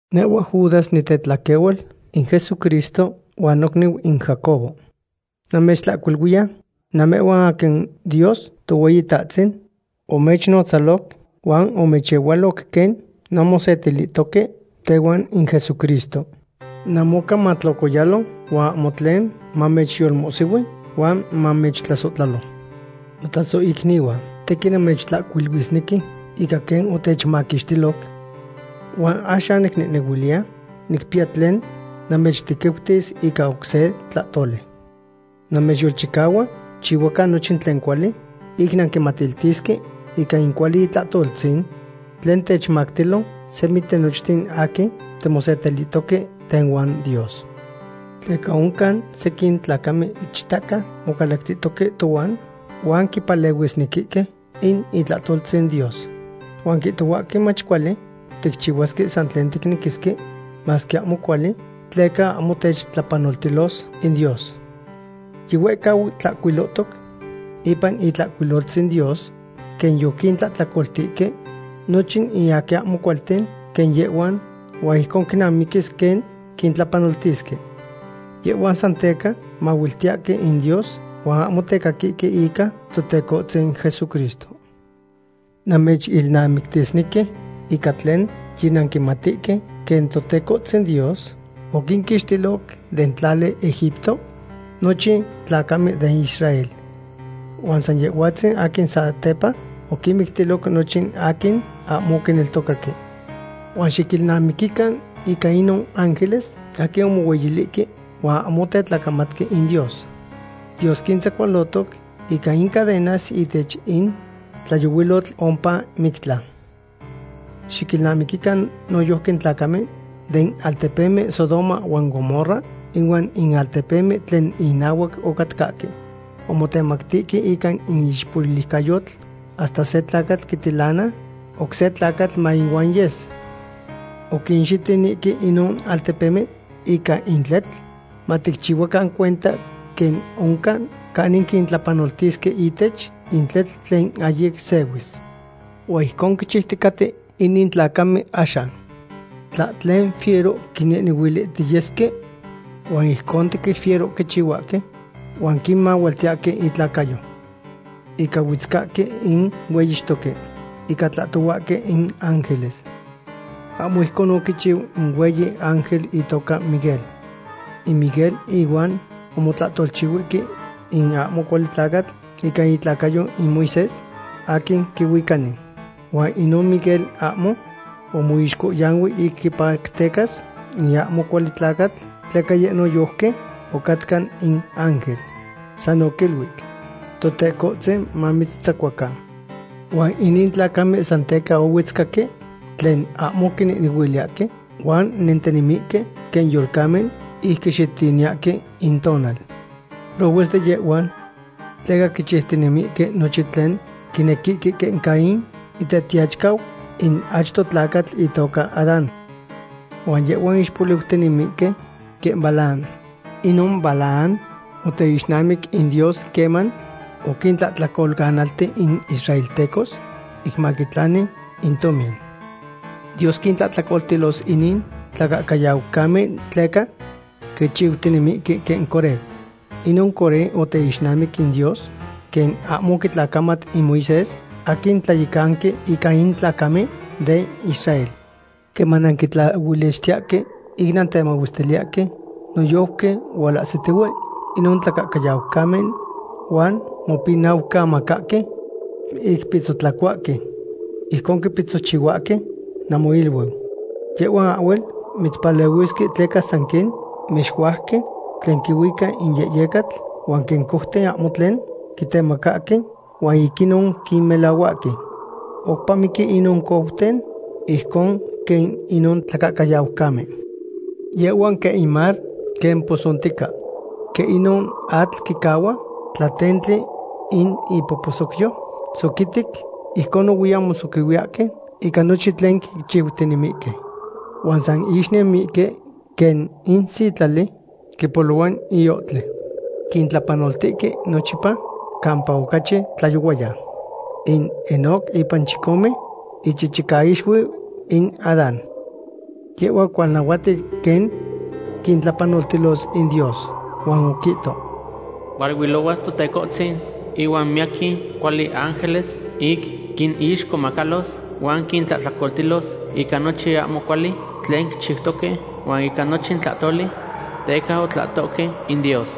Nehhua Judas nitetlaquehual in Jesucristo, huan nocniu in Jacobo. Namechihcuiluiya namehhuan aquin Dios Tohueyitahtzin omechnotzaloc huan omechehualoc quen nanmosetilihtoque tehuan in Jesucristo. Namoca matlocoyalo huan ahmo tlen mamechyolmohsihui huan mamechtlasohtlalo. Notlasohicnihuan, tequin namechtlahcuiluisnequi ica quen otechmaquixtiloc. Huan axan nicnehnehuiliya nicpiya tlen namechtequiutis ica oc se tlahtoli. Namechyolchicahua xicchihuacan nochin tlen cuali ic nanquinmatiltisque ica in cuali itlahtoltzin tlen techmactilo semi tinochten aquin timosetilihtoque tehuan Dios. Tleca oncan sequin tlacamen ichtaca mocalactihtoque tohuan huan quipatlasnequihque in itlahtoltzin Dios. Huan quihtohuahque mach cuali ticchihuasque san tlen ticnequisque, masque ahmo cuali, tleca ahmo techtlapanoltilos in Dios. Yihuehcau tlahcuilohtoc ipan Itlahcuiloltzin Dios quen yoquintlahtlacoltihque nochin in aquin ahmo cualten quen yehhuan, huan ijcon quinamiquis quen quintlapanoltisque. Yehhuan san teca mahuiltiyahque in Dios huan ahmo tecaquihque ica Totecohtzin Jesucristo. Namechilnamictisnequi ica tlen yinanquimatihque, quen Totecohtzin Dios oquinquixtiloc den tlali Egipto nochin in tlacamen den Israel. Huan san Yehhuatzin aquin satepa oquinmictiloc nochin aquin ahmo oquineltocaque. Huan xiquilnamiquican ica inon ángeles aquin omohueyilihque huan ahmo otetlacamatque in Dios. Dios quintzacualotoc ica in cadenas ihtech in tlayohuilotl ompa mictlan. Xiquilnamiquican noyojqui in tlacamen den altepemen Sodoma huan Gomorra ihuan in altepemen tlen inahuac ocatcahque. Omotemactihque ica in ixpoliucayotl hasta se tlacatl quitilana oc se tlacatl maihuan yes. Oquinxitinihque inon altepemen ica in tletl, maticchihuacan cuenta quen oncan canin quintlapanoltisque ihtech in tletl tlen ahyic sehuis. Huan ijcon quichiuticaten inin tlacamen axan. Tlahtlen fiero quinehnehuilihtiyesque huan ijcon tequin fiero quichihuahque huan quinmahualtiyahque intlacayo. Inca huetzcahque in hueyixtoque. Inca tlahtohuahque in ángeles. Ahmo ijcon oquichiu in hueyi ángel itoca Miguel. In Miguel ihuan omotlahtolchihuihque in ahmo cuali tlacatl ica itlacayo in Moisés, aquin quihuicani. Huan inon Miguel ahmo omoixcohyanui ic quipactecas in ahmo cuali tlacatl, tleca yeh noyojqui ocatca in ángel. San oquiluic: “Totecohtzin mamitzahhuacan.” Huan inin tlacamen san teca huetzcahque in tlen ahmo quinehnehuiliyahque, huan nentinemihque quen yolcamen, ic quixitiniyahque intonal. ¡Prohues de yehhuan! Tleca quichiutinemihque nochin tlen quinequihque quen Caín itetiyachicau in achto tlacatl itoca Adán. Huan yehhuan ixpoliutinemihque quen Balaam. Inon Balaam oteixnamic in Dios queman oquintlahtlacolanaltic in israeltecos, ic maquitlani in tomin. Dios quintlahtlacoltilos inin tlacahcayaucamen tleca quichiutinemihque quen Coré. Inon Coré oteixnamic in Dios quen ahmo oquitlacamat in Moisés aquin tlayecanqui ica in tlacamen den Israel. Queman nanquitlaolichtiyahque ic nantemahuestiliyahque, noyojqui hualahsitihue inon tlacahcayaucamen huan mopinaucamacahque ic pitzotlacuahque. Ijcon quipitzochihuahque namoiluiu. Yehhuan ahhuel mechpalehuisque tleca san quen mexuajque, tlen quihuica in yehyecatl, huan quen couten ahmo tlen quitemacahque, huan ic inon quinmolehuahque. Oupa miqui inon couten ijcon quen inon tlacahcayaucamen. Yehhuan quen in mar quen posontica. Quen inon atl quicahua tlatentli in ipoposocyo soquitic, ijcon nohuiyan mosoquihuiyaque ica nochin tlen quichiutinemihque. Huan san ixnemihque quen in sitlali quipolohua iohtli. Quintlapanoltihque nochipa campa ocachi tlayohuayan. In Enoc ipan chicome ichichicaixuiu in Adán. Yehhua oquihualnahuatic quen quintlapanoltilos in Dios. Huan oquihto: “Hualuilohuas Totecohtzin inuan miyaquin cuali teángeles, ic quinixcomacalos huan quintlahtlacoltilos ica nochin ahmo cuali tlen quichiutoque, huan ica nochin tlahtoli teca otlahtohque in Dios.”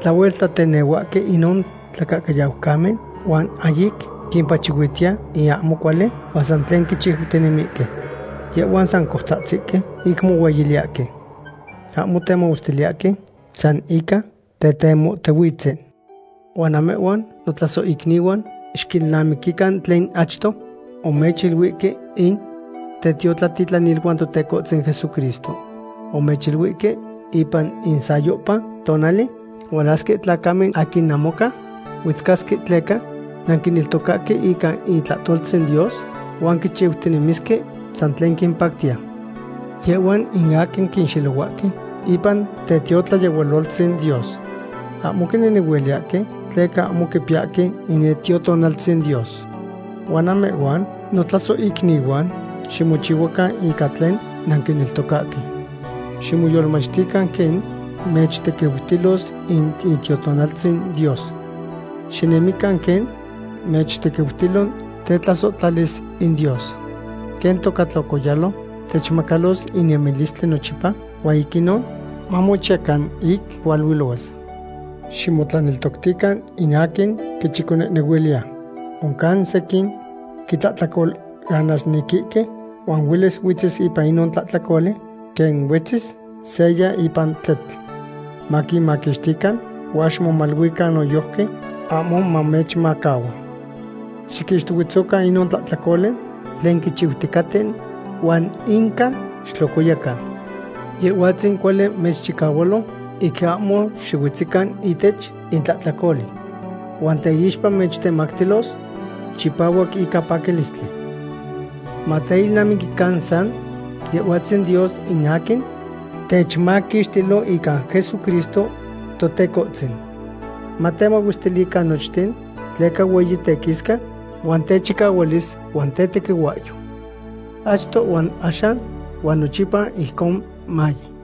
Tlahuel tlatenehuahque inon tlacahcayaucamen huan ahyic quimpachihuitiya in ahmo cuali, huan san tlen quichiutinemihque. Yehhuan san coutzahtzihque ic mohueyiliyahque. Ahmo temahuestiliyahque, san ica tetemotihuitzen. Huan namehhuan, notlasohicnihuan, xiquilnamiquican tlen achto omechiluihque in tetiotlatitlaniluan Totecohtzin Jesucristo. Omechiluihque: “Ipan in sayohpa tonali hualasque tlacamen aquin namoca huetzcasque tleca nanquineltocahque ica itlahtoltzin Dios huan quichiutinemisque san tlen quimpactiya.” Yehhuan in aquin quinxelohuahque ipan tetiotlayehualoltzin Dios. Ahmo quinehnehuiliyahque tleca ahmo quipiyahque in Itiotonaltzin Dios. Huan namehhuan, notlasohicnihuan, ximochicahuacan ica tlen nanquineltocahque. Ximoyolmachtican quen mechtequiutilos in Itiotonaltzin Dios. Xinemican quen mechtequiutilo tetlasohtlalis in Dios. Quen toca tlocoyalo, techmacalos in nemilistli nochipa huan ic inon mamochiyacan ic hualuilohuas. Ximotlaneltoctican in aquin quichiconehnehuiliya. Oncan sequin quitlahtlacolanasnequihque huan huelis huetzis ipan inon tlahtlacoli quen huetzis seya ipan tletl. Maquinmaquixtican huan ximomaluican noyojqui ahmo mamechmahua. Xiquixtohuetzocan inon tlahtlacoli tlen quichiuticaten huan inca xitlocoyacan. Yehhuatzin cuali mechchicahualo ic ahmo xihuetzican ihtech in tlahtlacoli. Huan teixpa mechtemactilos chipahuac ica paquilistli. Mateilnamiquican san Yehhuatzin Dios in aquin techmaquixtilo ica Jesucristo Totecohtzin. Matemahuestilican nochten tleca hueyi tequisca huan techicahualis huan tetequihuahyo. Achto huan axan huan nochipa ijcon maye.